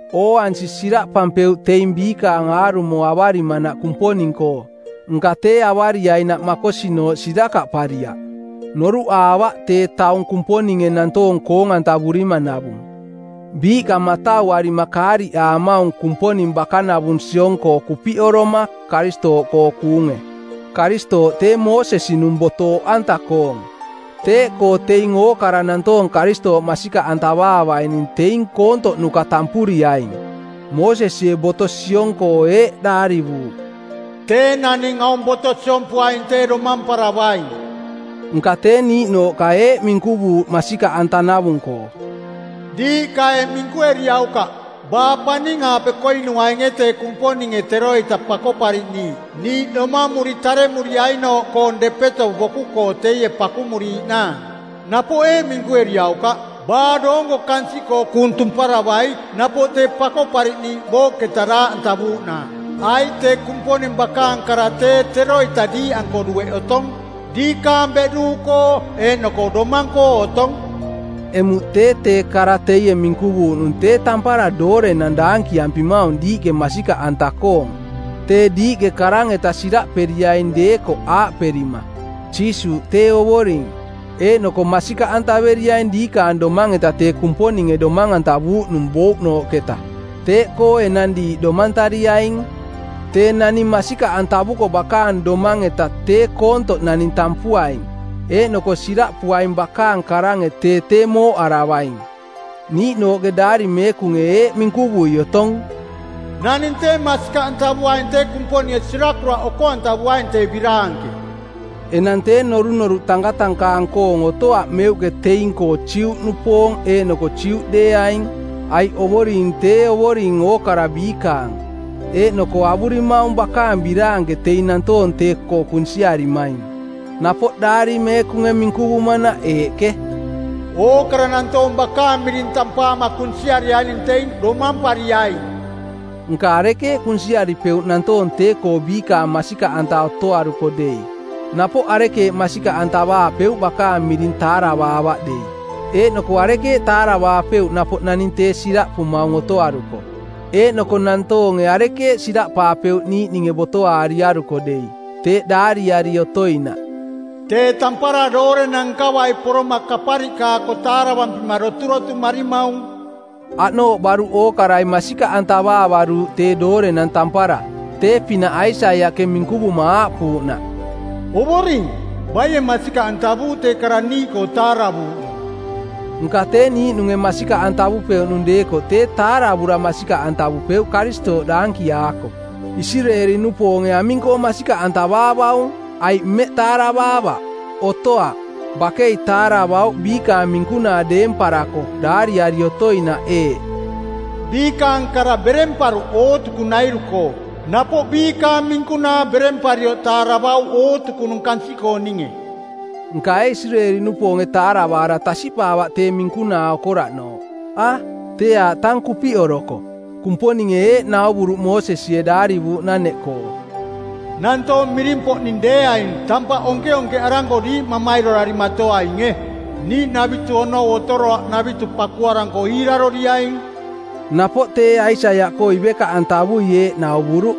Ooansi siraꞌpampeuꞌ teing biikaang aarumo avarimanaꞌ Kumponing-koo, nka tee avariainaꞌ makosinooꞌ sirakaꞌpariaꞌ. Noruꞌaavaꞌ tee taung Kumponinge nantoong koong-antavurimanavung. Biiꞌka matauarima kaariꞌaamaung Kumponing bakanavung siong-koo kupiꞌoroma, Karistooꞌkoo kuunge. Karistooꞌ tee Moosesi-nung boto oꞌanta-koong. Teeꞌkoo teing ookara nantoong Karistooꞌ masikaꞌantavaavaining teing koontoꞌnuka tampuriaing. Moosesie boto siong-koo eeꞌ daarivuuꞌ, “Tee naning aung boto siompuaing tee domamparavaing.” Nka tee niiꞌnooꞌka eeꞌ minkuvuuꞌ masikaꞌantanavung-koo, “Diiꞌka eeꞌ minkueriaukaꞌ: Baa paning-aape koinuainge tee Kumponinge Teroita Pakoꞌpariꞌniiꞌ niiꞌ domamuri taremuriainooꞌkoong depeto boku-koo teie pakumuriiꞌnaang? Napoꞌ eeꞌ minkueriaukaꞌ: Baa doonko kansiꞌkoo kuung tumparavai napoꞌ tee Pakoꞌpariꞌniiꞌ booꞌketa daaꞌantavuuꞌnaang? Aiꞌ tee Kumponing bakaang kara tee teroita diiꞌanko dueꞌ otong, diikaang beꞌduuꞌkoo eeꞌnoko domang-koo otong.” Emuꞌ tee tee kara teie minkuvuuꞌnung tee tampara doorenang daankiampimaung diiꞌke masikaꞌanta-koong. Tee diiꞌke karang-eta siraꞌperiaing deekoꞌ aaꞌperima, “Jiisuuꞌ tee Ovoring,” eeꞌnoko masikaꞌantaveriaing diikaang domang-eta tee Kumponinge domang-antavuuꞌ nung bouꞌnooꞌketa, teeꞌkoo enang diiꞌ domantariaing. Tee naning masikaꞌantavuko bakaang domang-eta tee koontoꞌ naning tampuaing; eeꞌnoko siraꞌpuaing bakaang karange tee tee mooꞌaravaing. Niiꞌnooꞌke Daari Meekunge eeꞌ minkuvui otong, “Naning tee masikaꞌantavuaing tee Kumponinge sirakuraꞌ oko-antavuaing tee biraanke.” Enang tee norunoruꞌ tankatankaang-koong otoaꞌ meuꞌke teing-koo Juꞌnupoong eeꞌnoko Juꞌdeeaing, aiꞌ Ovoring tee Ovoring ookara biikaang, eeꞌnoko avurimaung bakaang biraanke teing nantoong tee-koo kunsiarimaing. Napoꞌ Daari Meekunge minkuvumanaꞌ eeꞌke, “Ookara nantoong Bakaang miring tampaama kunsiariaining teing domampariaing.” Nka arekeeꞌ kunsiaripeuꞌ nantoong tee-koo biikaang masikaꞌanta otoaruko dei? Napoꞌ arekeeꞌ masikaꞌantavaapeuꞌ bakaang miring taaravaavaꞌ dei? Eeꞌnoko arekeeꞌ taaravaapeuꞌ napoꞌ naning tee siraꞌpumaung otoaruko? Eeꞌnoko nantoonge arekeeꞌ siraꞌpaapeuꞌ niiꞌninge botoaariaruko dei? Teeꞌ daariari otoinaꞌ, “Tee tampara doorenang nkavai poroma kapariꞌkaako taaravampira doturotumarimaung.” Aꞌnooꞌ baruꞌ ookarai masikaꞌantavaavaruuꞌ tee doorenang tampara, tee-pinaꞌ Aisaiaꞌke minkuvuma aaꞌpuuꞌnaꞌ, “Ovoring, baie masikaꞌantavuuꞌ tee kara niiꞌkoo taaravuuꞌnung?” Nka tee niiꞌnunge masikaꞌantavupeuꞌnung deekoꞌ tee taaravura masikaꞌantavupeuꞌ Karistooꞌ daankiaako. Isireeli-nupoonge aming-koo masikaꞌantavaavaung, aiꞌ mmeꞌ taaravaavaꞌ? Otoaꞌ. Bakei taaravauꞌ biikaang minkunaa deemparako daariari otoinaꞌ eeꞌ, “Biikaang kara beremparuꞌ ootukunairu-koo. Napoꞌ biikaang minkunaa beremparioꞌ taaravauꞌ ootukunung kansiꞌkooninge.” Nka ee Isireeli-nupoonge taaravaara tasiꞌpaavaꞌ tee minkunaa okoraꞌnooꞌ? A, tee aaꞌ tang kupiꞌoroko. Kumponinge eeꞌ nauvuruꞌ Moosesie daarivuuꞌnaneꞌkoo, “Nantoong miring-poꞌning deeaing tampaꞌ onkeonkeꞌaranko diiꞌ mamairorarimatoainge. Niiꞌnavitu onou otoroaꞌnavitu pakuaranko iiraroriaing.” Napoꞌ tee Aisaiaꞌkoo ivekaꞌantavui eeꞌ nauvuruꞌ,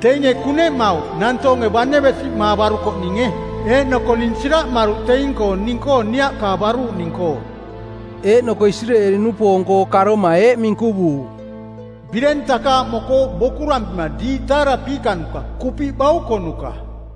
“Teinge kuneꞌmauꞌ nantoonge bane besiꞌmaavarukoꞌninge. Eeꞌnoko ning siraꞌmaruꞌ teing-koo ning-koo niaꞌkaavaruꞌning-koo.” Eeꞌnoko Isireeli-nupoong-koo karoma eeꞌ minkuvuuꞌ, “Bireng takaaꞌmokooꞌ bokurampima diiꞌ taarapiikanuka, kupiꞌ baukonuka.”